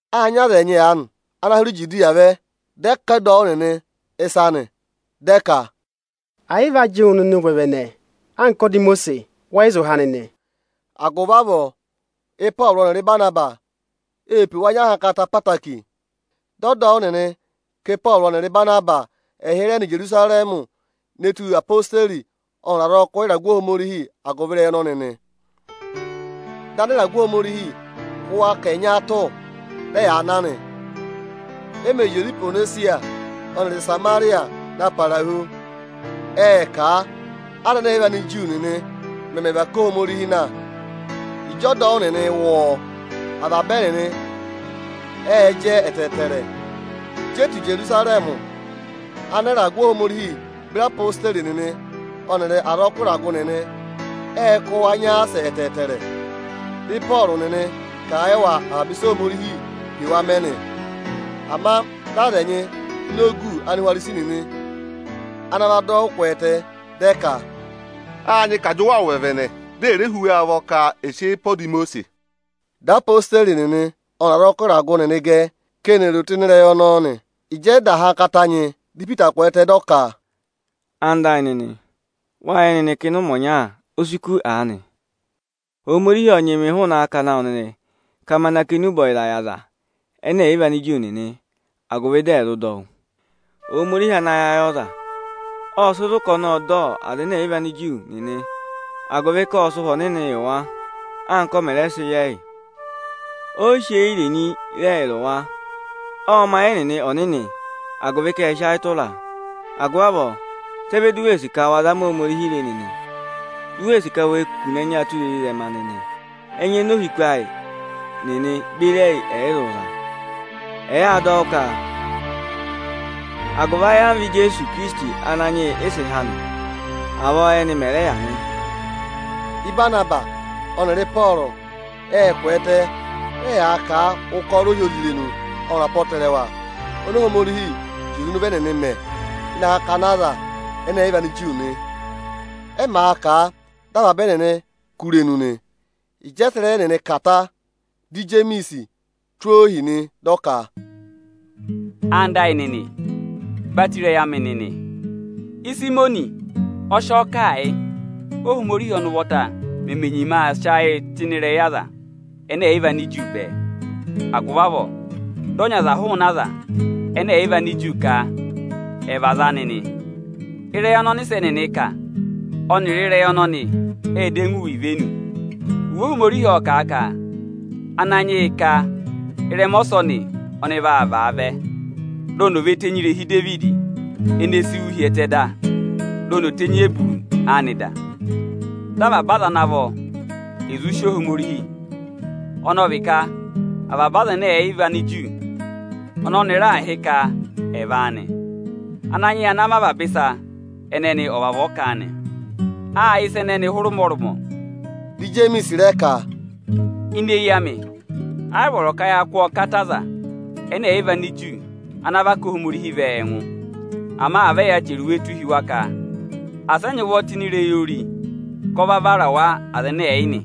Â nyị aza ẹnyị aanị ana hụrẹ Ijudiya vẹ, dị ẹyaa zụ̀ ọdọwụ nịnị ịsa nị, dị ẹ ka, “Ẹ̀ yị vị a jị wụ nịnị ụvẹvẹnẹ anka ọda Imosiisi, wẹ yị zụ há nịnị.” Agụvị avọọ, Ịpọọrụ ọnịrị Ịbanabasị ê pe wa nyị ahankata ẹtẹẹtẹrẹ. Dị ọdọwụ nịnị ka Ịpọọrụ ọnịrị Ịbanabasị ẹ̀ hịrẹ nọ Ijerusarẹmị ne tù odeyi ọnịrị azọkụ ịragụ Ohomorihi agụvị ịrẹyị ọnọnị nị. Dị anịragụ Ohomorihi kụ́ wa ka ẹ̀ nyaatụ, dị ẹyaa na nị. E mè zị oze Ihwonesiya ọnịrị Ịsamarịya na para hu, ệ kà a, Anigiriki nịnị mẹmẹ và ká Ohomorihi na. Ịjị ọdọwụ nịnị wụ́ ọọ, avaba ẹnịnị ệ jẹ ẹtẹẹtẹrẹ. Ịjị e tù Ijerusarẹmị, anịragụ Ohomorihi beri odeyi nịnị ọnịrị azọkụ ịragụ nịnị ệ kụ́ wa nyaasẹ ẹtẹẹtẹrẹ. Dị Ịpọọrụ nịnị kà a yị wa avaba ịsị Ohomorihi pe wa mẹ nị. Ama dị aza ẹnyị ini ogu Anihwarisi nịnị ana va dọ wụ́ kwẹẹtẹ, dị ẹ ka, “Â nyị ka à jị wa ụvẹvẹnẹ, di è re hú wa ụvọ ka è sị eyi pe ọda Imosiisi!” Dị odeyi nịnị ọnịrị azọkụ ịragụ nịnị gẹ, ka eni è ro tụ́ ịnị ịrẹyị ọnọọ nị. Ịjị ẹ da ahankata nyị, di Ipita kwẹẹtẹ, dị ọ ka, “Anda ayị nịnị, wâ yẹ nịnị ka ịnị ụmẹ ọnya o si kù aanị, Ohomorihi ộ nyị mị hụụnị akakana awụ nịnị ka ma na kà enube ọyịza yị Anigiriki nịnị, agụvị dị ẹ̀ zụ dọ wụ́. Ohomorihi ana yẹ ayị ọza, ộ sị zụ̀ ka ọnị ộ dọ Anigiriki nịnị, agụvị ka ộ sị Ụhwẹ Ọnịnị yị wa, anka ọ mẹ̀ rẹ sị yị ẹyị. O yi sị eyi irenyi re ẹyịrị wa. Ộ mẹ ayị ẹnịnị ọnịnị, agụvị ka ệ sị ayị tụra a. Agụvị avọọ, sị ẹ vẹ di u wee sì ka wa zama Ohomorihi re nịnị, di u wee sì ka we kune ẹnya tụra ezirẹma nịnị, ẹnya oni ohiku ayị nịnị beri ẹyị ẹ̀ yị zụ za? Ẹyị â dọ wụ́ ka agụvị ayamva Ijeesu Ikirisiti Ananyị yị ị sị há nị. Avọọ ẹ́nị mẹ̀ rẹ yà nị.” Ịbanabasị ọnịrị Ịpọọrụ ệ kwẹẹtẹ, dị ẹyaa kà a ụkọrọ ohyozirenu ọnịrị apọtẹrẹwa oni Ohomorihi zị oze ịnị ụvọ ẹnịnị mẹ ịnị akakana Anigiriki nị. Ẹ màa kà a, dị avaba ẹnịnị kú irenu nị. Ịjị ẹ sị ịrẹyị ẹnịnị kà ta, dị Ijemiisi tụ́ ohi nị, dị ọ ka, “Ẹwụ nịnị ẹyịnyara amị! Batọ ịrẹyị amị nịnị! Ịsayịmọnị ọ sị ọọ kà a yị, Óhomorihi ọnị ụvọta meme nyima aa sị ayịị tụ́ ịnị ịrẹyị Anigiriki bẹẹ. Agụvị avọọ dị ọ nyị aza hụụnị Anigiriki ka ẹ̀ vị aza anị nị. Ịrẹyị ọnị ọnịsẹ nịnị kà ọnịrị ịrẹyị ọnọnị ệ dọ ẹngụ ivenu. Iwe Ohomorihi ộ kà a ka: ‘Ananyị yị ka ịrẹma ọsọnị ọnị vaa vaavẹ, di oni ò ve tenyi irehi Idevidi ene si wú hi ẹtẹ dà, di oni tenyi eburu anị dà; di avaba aza ana vọ è zụ sì Ohomorihi, ọnị ọ vị ka avaba Anigiriki ọnị ọnị raà hị́ ka ẹ̀ vị áanị. Ananyị yị ana mẹ avaba ịsa ẹnẹnị ọ vavọọ kà a nị.’ Â yẹ ịsa ẹnẹnị hụrẹ ụmọrụmọ.” Dị Ijemiisi rẹ ka, “Ini eyi amị, ayị vọrọ ka ya kụ́ ọọ kata Anigiriki ana và ká Ohomorihi vẹ ẹngụ. Ama à vẹ ya chẹrẹ iwe tụ́ hi wa ka asị ẹ nyị ụvọ tụ́ ịnị ịrẹyị ori, ka ọ va vara wa aza ẹnẹ ẹ̀ yị nị.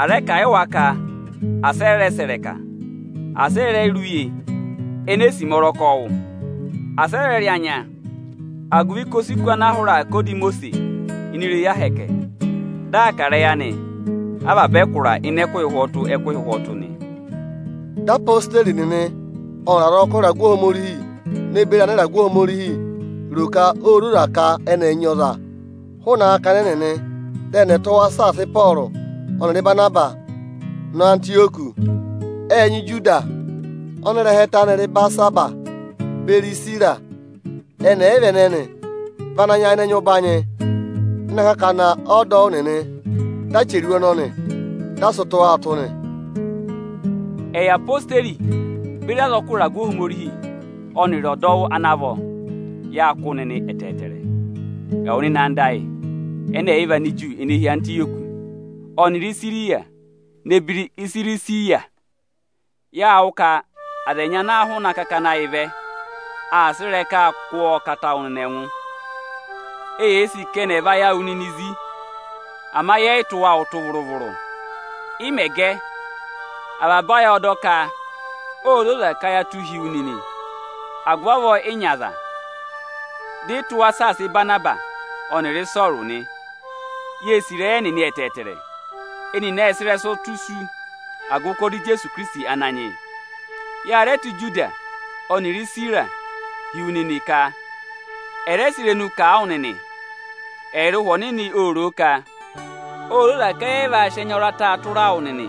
À rẹ kà a yị wa ka asị ẹ rẹ sẹ̀ ịrẹka, asị ẹ rẹ̀ rẹ rị uye enee sima ọrọkọ wụ. Asị ẹ rẹ rị anya. Agụvị ka o si kù ana a hụrẹ aa kà ọda Imosiisi ini irehi Ohomorihi, dị aa kà ịrẹyị anị avaba ẹkụra ịnị ẹkụhị ụhwọtụ-ẹkụhị ụhwọtụ nị.” Dị odeyi nịnị ọnịrị azọkụ ịragụ Ohomorihi ne beri anịragụ Ohomorihi ro ka ô zoza ka ẹnị ẹ̀ nyị ọza hụụnị akakana ẹnịnị, dị ẹnị ẹ̀ tụ́ wa saasa Ịpọọrụ ọnịrị Ịbanabasị nọ Antịyọkị. Ệ nyị Ijudasi ọnị ịrẹha ẹtẹ anị rị Ibarisabasi, beri Isira. Ẹnị ẹyịva ẹnẹnị vị ana nyayịnẹ nyị ụbanyị ịnị akakana ọdọwụ nịnị. Dị a chẹrẹ iwe ọnọnị, dị a sị tụ́ wa ụtụ nị: “Ẹyị odeyi beri azọkụ ịragụ Ohomorihi ọnịrị ọdọwụ ana vọ, yâ kụ́ wụ nịnị ẹtẹẹtẹrẹ, ẹwụ nịnị anda ayị ẹnẹ ẹ̀ yị vị Aniju ene hi Antịyọkị ọnịrị Isiriya ne beri Isirisiya! Yâ wụ́ ka aza ẹnyị ana hụụnị akakana ayị vẹ, aa sẹ̀ ịrẹkaa kụ́ ọọ kata wụ nịnị ẹngụ. Eyee sì ka ẹnị ẹ̀ và ayị awụ nịnị zí. Ama yẹ yị tụ́ wa ụtụ vụrụ-vụrụ. Ị mẹ̀ gẹ, avaba ayị ộ dọ ka ô zoza ka ya tụ́ hi wu nịnị. Agụvị avọọ ị nyị aza, dị ị tụ́ wa saasa Ịbanabasị ọnịrị Ịpọọrụ nị. Yee sì ịrẹyị ẹnịnị ẹtẹẹtẹrẹ. Ẹnịnị ệ sị ịrẹsụ tụ́ isu agụvị ụkọrọ Ijeesu Ikirisiti Ananyị yị. Ya rẹ tụ́ Ijudasi ọnịrị Isira hi wu nịnị ka ẹ̀ rẹ sị irenu kà a wụ nịnị. Ẹyịrị Ụhwẹ Ọnịnị ô ro o ka ô zoza ka à sị sị ẹnya ọrata tụra wụ nịnị,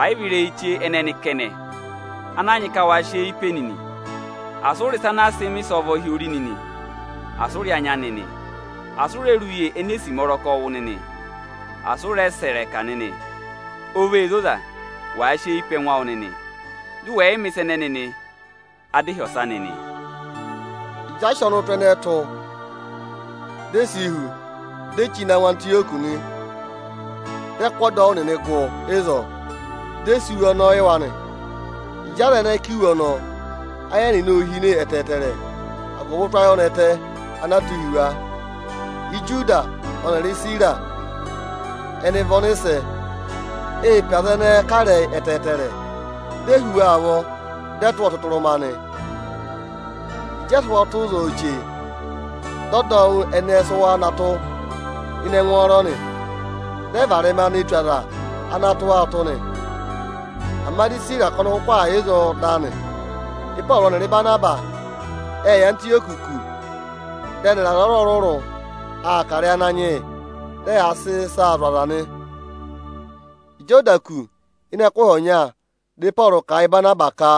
ẹ̀ yị vị ịrẹyị chee ẹnẹnị kẹnẹ, ana a nyị ka wa sị eyi pe nịnị: Asị ụ rị ịsa ana a sị mẹ̀ ịsọvọ hi ori nịnị! Asị ụ rị anya nịnị; asị ụ rẹ rị uye enee sima ọrọkọ wụ nịnị! Asị ụ rẹ sẹ̀ ịrẹka nịnị! O vee zoza, wàa sị eyi pe ẹngụ awụ nịnị, dị ụ wẹ̀ yị mẹ̀ ịsa ẹnẹnị nịnị nị. Adịhyọsa nịnị!” Ịjị a sị ọnụtụ ẹnẹẹ tụ́, di e si hu, di e chí na ngụ Antịyọkị nị. Dị ẹ kụ́ ọdọwụ nịnị gụ ịzọọ, dị ẹ sị iwe ọnọọ yị wa nị. Ịjị aza ẹnẹẹ kà iwe ọnọọ, ayị ẹnẹnị ô hine ẹtẹẹtẹrẹ agụvị ụtụ ayọnẹtẹ ana a tụ́ hi wa. Ijudasi ọnịrị Isira ẹnị vị ọnịsẹ. Ê pe aza ẹnẹẹ kà ịrẹyị ẹtẹẹtẹrẹ, di e hú wa ụvọ, dị ẹ tụ́ wa ọtụtụrụma nị. Ịjị ẹ sị ụhwọ tụ́ ịzọọ chee, dị ọdọwụ ẹnẹẹ sị wa na tụ́ ịnị ẹngwọọrọ nị. Dị ẹ varẹma ne tù aza ana tụ́ wa ụtụ nị. [Ama di Isira ka ọnị kụkụ aa yà ịzọọ da nị.] Ịpọọrụ ọnịrị Ịbanabasị ệ yà Antịyọkị kù, dị ẹnịrị aza ọrụrụ-ọrụrụ aa kà ịrẹyị Ananyị yị, dị ẹyaa sị ịsaa zụ̀ aza nị. Ịjị ọ da kù, ịnị ẹkụhị ọnya, dị Ịpọọrụ kà a yị Ịbanabasị ka,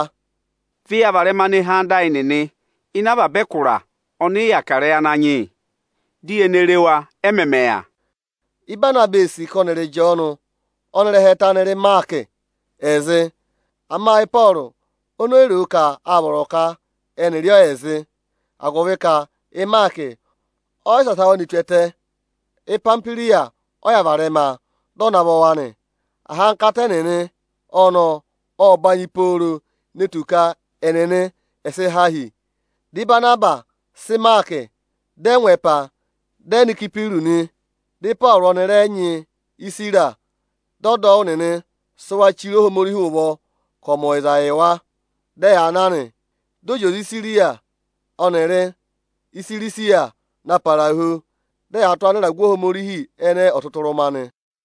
“Vẹ ya varẹma ne hee anda ayị nịnị ịnị avaba ẹkụra ọnị ị yà kà ịrẹyị Ananyị yị, di ye ne re wa, ẹ mẹmẹ yà!” Ịbanabasị ee sì ka ẹnịrị Ịjọọnụ ọnị ịrẹha ẹtẹ anị rị Ịmaakị ẹ̀ zị. Ama Ịpọọrụ oni o yi ro ka â vọrọ ka ẹnị rị ọọ ẹ̀ zị, agụvị ka Ịmaakị ọ yị saasa wa ne tù ẹtẹ; Ipamihwiriya ọ yà varẹma, dị ọ navọ wa nị. Ahankata ẹnịnị ọnọọ ộ banyị pooro ne tù ka ẹnịnị sị há hi. Dị Ịbanabasị sị Ịmaakị, dị ẹ ngụ ẹpa, dị ẹ nọ Ịsayịpịrụsị nị. Dị Ịpọọrụ ọnị rẹ nyị Isira, dị ọdọwụ nịnị sị wa chire Ohomorihi ụvọ ka ọ̀ mẹ ọyịza yị wa; dị ẹyaa na nị. Dị ọ zị oze Isiriya ọnịrị Isirisiya na para hu, dị ẹyaa tụ́ anịragụ Ohomorihi ẹnẹẹ ọtụtụrụma nị.